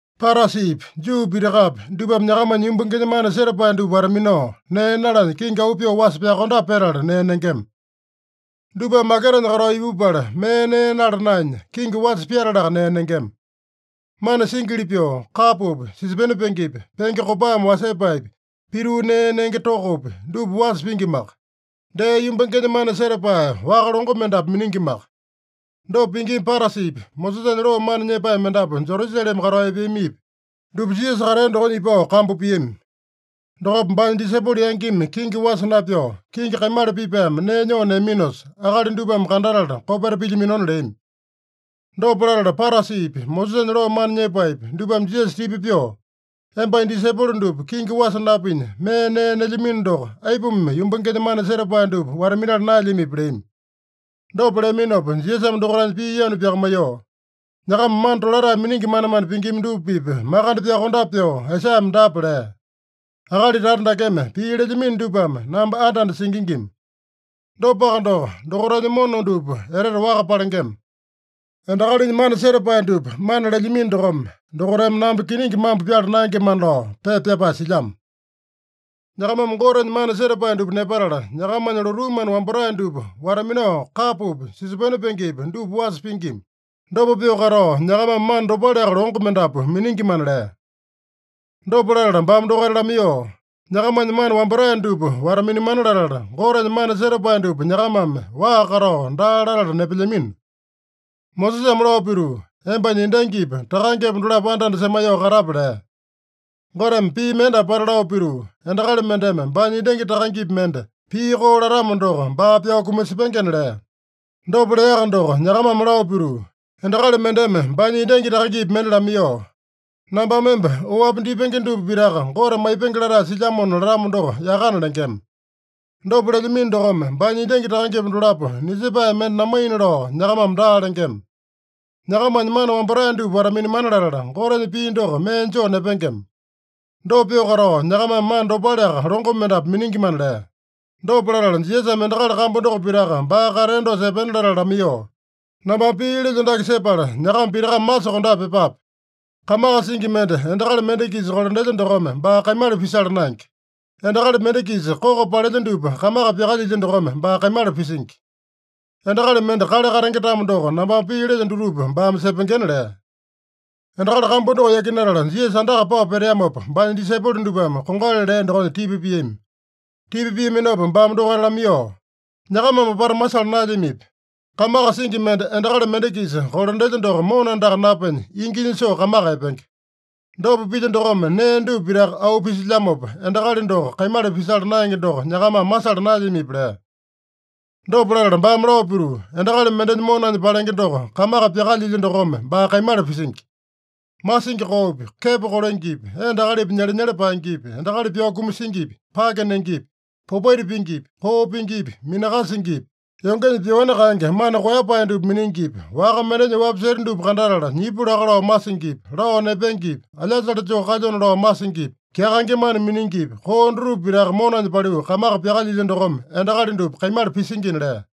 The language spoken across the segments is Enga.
Parasipi, Juu pitakapi dupame nyakamanya yumbangenya mana setapae dupa wata-minao, nee nalanya kingi auu pyoo wasa pyakondape petala nee nengema. Dupame maketanya katao ipupala mee nee nala naenya, kingi wasa pyatalaka nee nengema. Mana singili pyoo, kapopi, sisopene pengepi, penge kopame wasepaepi, pituu nee nenge tokopi, dupa wasa pingimaka. Dee yumbangenya mana setapae waka longo mendapu miningimaka. Dopa pingima Parasipi, Mosesanya loo mana nyepae mendapu Jerusalema katao epeamipi, dupa Jisasa katea dokonya ipao kambu piami. Dokopa baanya disaipolo yangimi kingi wasa napyao, kingi kaimala pipaeme nee nyoo neaminosa, akali dupame kandatala kopeta pilyaminona leami. Dopa latala Parasipi, Mosesanya loo mana nyepaepi, dupame Jisasa tipa pyoo, “Embanya disaipolo dupa kingi wasa napinya mee nee nelyamino doko, aipuma yumbangenya mana setapae dupa wata-minala naelyamipi?” leami. Dopa leaminopa Jisasame dokaitanya pii yanu pyakamaiyoo, “Nyakama mana tolatae miningi manemane pingima dupa-pipa makande pyokondape pyoo Aisaiyame dapa lea: ‘Akali tata dakeme pii lelyamino dupame namba anda-anda singingima. Dopaka doko, dokaitanya mona dupa etete waka palengema. Endakalinya mana setapae dupa mana lelyamino dokome, dokaitame namba kiningi mambo pyala naengemana’ lao pepa pyapae silyamo. Nyakamame Gotenya mana setapae dupa nepatala, nyakamanya lotuu mana wambatae dupa wata-minao, kapopi, sisopene pengepi dupa wasa pingima. Dopa pyoo katao, nyakamame mana dopaleaka longo mendapu miningimana” lea. Dopa latala baame dokaita lamaiyoo, “Nyakamanya mana wambatae dupa wata-minamana latala, Gotenya mana setapae dupa nyakamame waa katao daa latala nepelyamino. Mosesame lao pituu, ‘Embanya endangipa takangepa dolapo anda-anda semaiyoo katape’ lea. Goteme pii mende apata lao pituu, ‘Endakali mendeme baanya endangi takangepi mende pii koo latamo doko, baa pyao kumasepengena’ lea. Dopa leaka doko nyakamame lao pituu, ‘Endakali mendeme baanya endangi takangepi mende lamaiyoo, “Nambame emba oapi dipenge dupa pitaka Gote maipengena latae silyamona” latamo doko yakana’ lengema. Dopa lelyamino dokome, baanya endangi takangepa dolapo nisepae mende namaina lao nyakamame daa lengema. Nyakamanya mana wambatae dupa wata-minamana latala, Gotenya pii doko mee joo nepengema. Dopa pyoo katao, nyakamame mana dopaleaka longo mendapu miningimana” lea. Dopa latala Jisasame endakali kambu doko pitaka baa katea dosa epena latala lamaiyoo, “Nambame pii lelyo dake sepala, nyakama pitakame masokondape pyepape: Kamaka singi mende endakali mende-kisa kolandelya dokome baa kaimala pisala naenge. Endakali mende-kisa koko palelya dupa kamaka pyakalyilya dokome baa kaimala pisingi. Endakali mende kale katenge-tamo doko, nambame pii lelyo dutupa baame sepengena” lea. Endakali kambu doko yakinatala Jisasa andaka pao peteamopa, baanya disaipolo dupame kongali lea dokonya tipa piami. Tipa piaminopa baame dokaita lamaiyoo, “Nyakamame apata masala naelyamipi? Kamaka singi mende endakali mende-kisa kolandelya doko mona andaka napenya, inginya soo kamaka epenge. Dopa pilya dokome nee dupa pitaka auu pisilyamopa, endakali doko kaimala pisala naenge doko nyakamame masala naelyamipi?” lea. Dopa latala baame lao pituu, “Endakali mendenya monanya palenge doko kamaka pyakalyingi dokome baa kaimala pisingi. Masingi koopi, kepo kolengepi, endapi akalipi nyelenyele paengepi, endakali pyao kumasingipi, pake nengepi, popaita pingipi, koo pingipi, minakasingipi, yongenya pyoani kaenge mana koeyapae dupa miningipi, waka mendenya oapi seta dupa kandatala nyipu laka lao masingipi, lao nepengepi, alyasale joo kalyona lao masingipi, kyakaenge mana miningipi, koo dutupa pitaka monanya paliu kamaka pyakalyilya dokome endakali dupa kaimala pisingina” lea.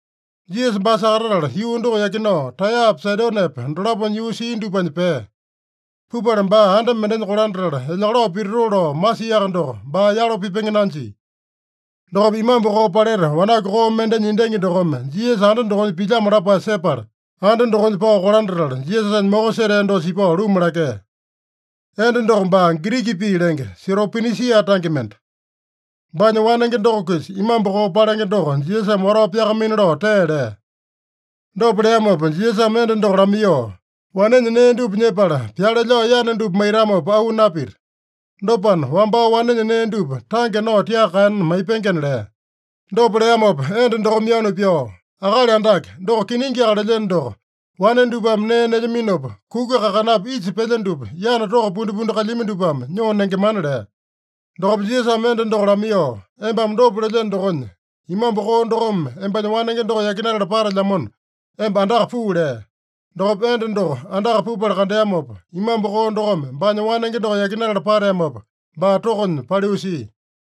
Jisasa baa sakatatala, yuu doko yakinao Taeyapa, Saidonepa dolaponya yuu sia dupanya pea. Pupala baa anda mendenya kolandatala, elyakalao pititoo lao masiaka doko, baa yalo pipenge nanjia. Dokopa imambu koo paleta wanaku koo mendenya endangi dokome Jisasa anda dokonya pilyamo lapae sepala, anda dokonya pao kolandatala, Jisasanya moko setea dosa ipao luma lakea. (Enda doko baa Giriki pii lenge, Siropinisia tange mende.) Baanya wanenge doko-kisa imambu koo palenge doko Jisasame watao pyakamaina lao tee lea. Dopa leamopa Jisasame enda doko lamaiyoo, “Wanenya nee dupa nyepala, pyale lao yana dupa maitamopa auu napita. Dopana, wambao wanenya nee dupa tange nao tiaka kaena maipengena” lea. Dopa leamopa enda dokome yanu pyao, “Akali Andake, doko kiningiaka lelyeno doko, wane dupame nee nelyaminopa, kuku kakanapi isa pelya dupa yana toko pundipundi kalyami dupame nyoo nengemana” lea. Dokopa Jisasame enda doko lamaiyoo, “Embame dopa lelyeno dokonya, imambu koo dokome embanya wanenge doko yakinatala patelyamona, emba andaka puu” lea. Dokopa enda doko andaka pupala kandeamopa, imambu koo dokome baanya wanenge doko yakinatala pateamopa, baa tokonya paliu sia.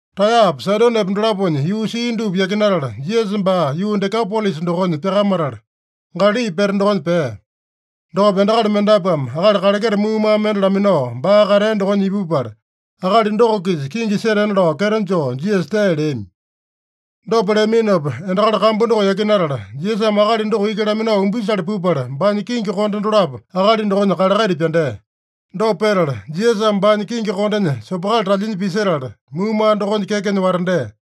Taeyapa, Saidonepa dolaponya yuu sia dupa yakinatala, Jisasa baa yuu Dekapolisa dokonya pyakamatala, Galali pete dokonya pea. Dokopa endakali mendapuame akali kaleketa muumaa mende laminao baa katea dokonya ipupala, akali doko-kisa kingi setena lao kyeto joo Jisasa tee leami. Dopa leaminopa endakali kambu doko yakinatala, Jisasame akali doko iki laminao umbisale pupala, baanya kingi konde dolapo akali dokonya kalekaita pyandea. Dopa petala Jisasame baanya kingi kondenya sopokali talyinya pisetala, muumaa dokonya kekenya watandea.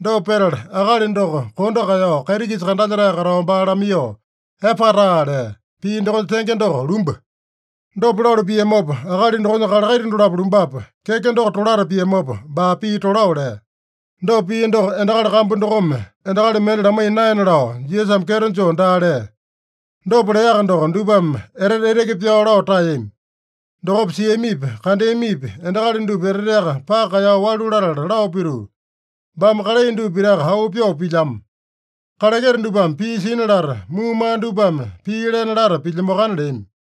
Dopa petala akali doko kondo kaeyao, kaiti-kisa kandalyetae katao baa lamaiyoo, “Epataa” lea. (Pii dokonya tenge doko, “Lumba.”) Dopa lalu piamopa, akali dokonya kalekaita dolapo lumbapa, keke doko tolata piamopa, baa pii tolao lea. Dopa pia doko endakali kambu dokome endakali mende lamaiya naena lao Jisasame kyeto joo daa lea. Dopa leaka doko, dupame etete eteke pyao lao taeyami. Dokopa siamipi, kandeamipi endakali dupa eteteaka paka kaeyao walu latala lao pituu, “Baame kalai dupa pitaka auu pyoo pilyamo. Kaleketa dupame pii sina lata, muumaa dupame pii lena lata pilyamoakana” leami.